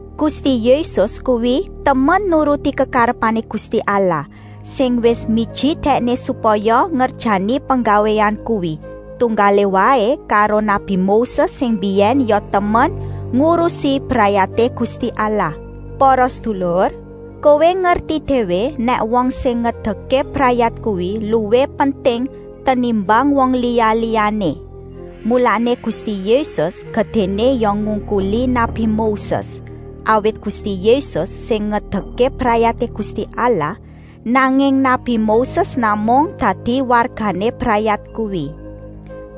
Gusti Yésus kuwi temen nuruti kekarepané Gusti Allah, sing wis miji Dèkné supaya ngerjani penggawéan kuwi, tunggalé waé karo nabi Moses sing mbiyèn ya temen ngurusi brayaté Gusti Allah. Para sedulur, kowé ngerti déwé nèk wong sing ngedekké brayat kuwi luwih penting tenimbang wong liya-liyané. Mulané Gusti Yésus gedéné ya ngungkuli nabi Moses, awit Gusti Yésus sing ngedekké brayaté Gusti Allah, nanging nabi Moses namung dadi wargané brayat kuwi.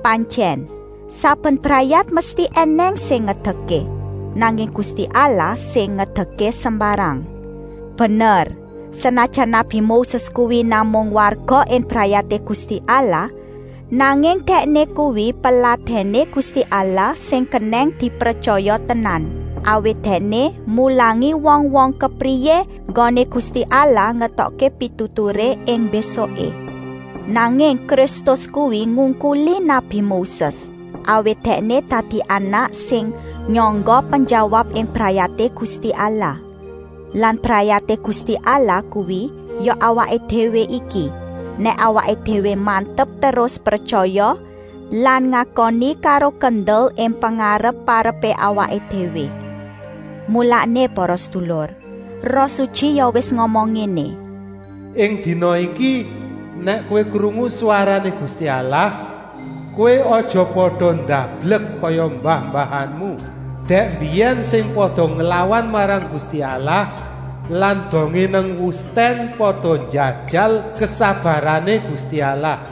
Pantyèn, saben brayat mesti ènèng sing ngedekké, nanging Gusti Allah sing ngedekké sembarang. Bener, senajan nabi Moses kuwi namung warga ing brayaté Gusti Allah, nanging dèkné kuwi peladèné Gusti Allah sing kenèng dipretyaya tenan, awit dèkné mulangi wong-wong kepriyé enggoné Gusti Allah ngetokké pituturé ing mbésuké. Nanging Kristus kuwi ngungkuli nabi Moses, awit Dèkné dadi anak sing nyangga penjawab ing brayaté Gusti Allah. Lan brayaté Gusti Allah kuwi ya awaké déwé iki, nèk awaké déwé mantep terus pretyaya lan ngakoni karo kendel ing pengarep-arepé awaké déwé. Mulané para sedulur, Roh Sutyi ya wis ngomong ngéné: “Ing dina iki, nèk kowé krungu swarané Gusti Allah, kowé aja pada ndablek kaya mbah-mbahanmu dèk mbiyèn sing pada nglawan marang Gusti Allah lan dongé nang wustèn pada njajal kesabarané Gusti Allah.”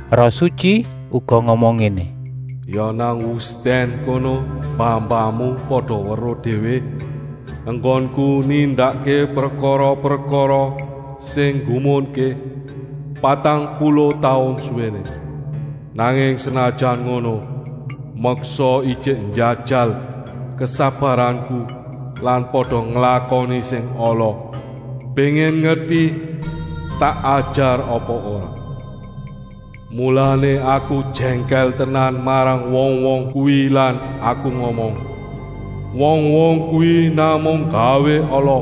Roh Sutyi uga ngomong ngéné: “Ya nang wustèn kono mbah-mbahanmu pada weruh déwé enggonku nindakké prekara-prekara sing nggumunké, patang puluh taun suwéné. Nanging senajan ngono, meksa ijik njajal kesabaranku lan pada nglakoni sing ala, kepéngin ngerti tak ajar apa ora. Mulané Aku jèngkèl tenan marang wong-wong kuwi lan Aku ngomong: ‘Wong-wong kuwi namung nggawé ala,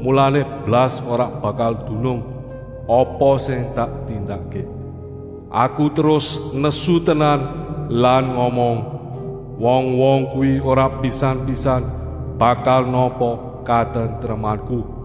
mulané blas ora bakal dunung apa sing tak tindakké.’ Aku terus nesu tenan lan ngomong: ‘Wong-wong kuwi ora pisan-pisan bakal nampa katentremanku.’”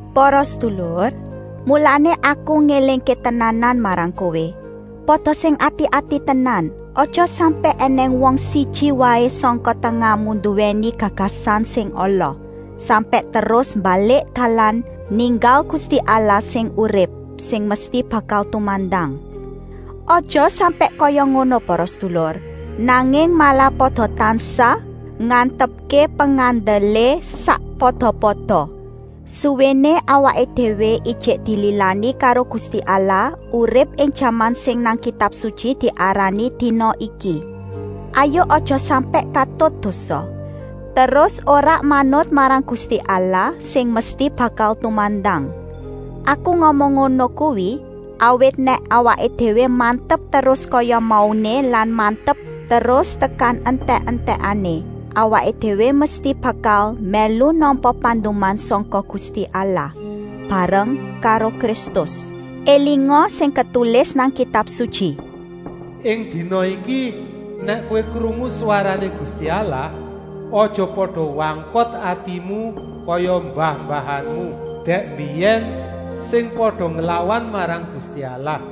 Para sedulur, mulané aku ngélingké tenanan marang kowé, pada sing ati-ati tenan, aja sampèk ènèng wong siji waé sangka tengahmu nduwèni gagasan sing ala, sampèk terus mbalik dalan ninggal Gusti Allah sing urip, sing mesti bakal tumandang. Aja sampèk kaya ngono para sedulur, nanging malah pada tansah ngantepké pengandelé sakpada-pada, suwéné awaké déwé ijik dililani karo Gusti Allah urip ing jaman sing nang Kitab Sutyi diarani “dina iki”. Hayuk aja sampèk katut dosa, terus ora manut marang Gusti Allah sing mesti bakal tumandang. Aku ngomong ngono kuwi, awit nèk awaké déwé mantep terus kaya mauné lan mantep terus tekan entèk-entèkané, awaké déwé mesti bakal mèlu nampa panduman sangka Gusti Allah, bareng karo Kristus. Elinga sing ketulis nang Kitab Sutyi: “Ing dina iki nèk kowé krungu swarané Gusti Allah, aja pada wangkot atimu kaya mbah-mbahanmu dèk mbiyèn, sing pada nglawan marang Gusti Allah.”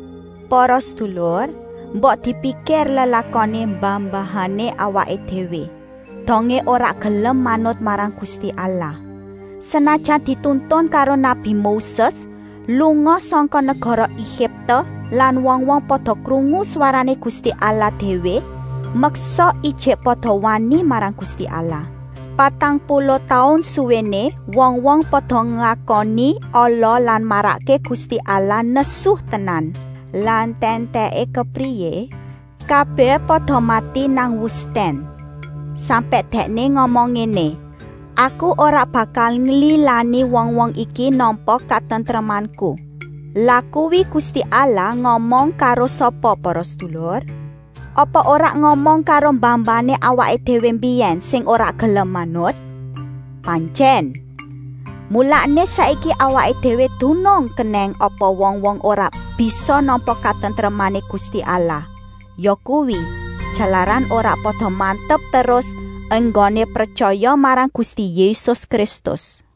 Para sedulur, mbok dipikir lelakoné mbah-mbahané awaké déwé, dongé ora gelem manut marang Gusti Allah. Senajan dituntun karo nabi Moses lunga sangka negara Egipte lan wong-wong pada krungu swarané Gusti Allah déwé, meksa ijik pada wani marang Gusti Allah. Patang puluh taun suwéné wong-wong pada nglakoni ala lan marakké Gusti Allah nesu tenan. Lah entèk-entèké kepriyé? Kabèh pada mati nang wustèn. Sampèk Dèkné ngomong ngéné: “Aku ora bakal nglilani wong-wong iki nampa katentremanku.” Lah kuwi Gusti Allah ngomong karo sapa para sedulur? Apa ora ngomong karo mbah-mbahané awaké déwé mbiyèn sing ora gelem manut? Pantyèn! Mulané saiki awaké déwé dunung kenèng apa wong-wong ora bisa nampa katentremané Gusti Allah, yakuwi, jalaran ora pada mantep terus enggoné pretyaya marang Gusti Yésus Kristus.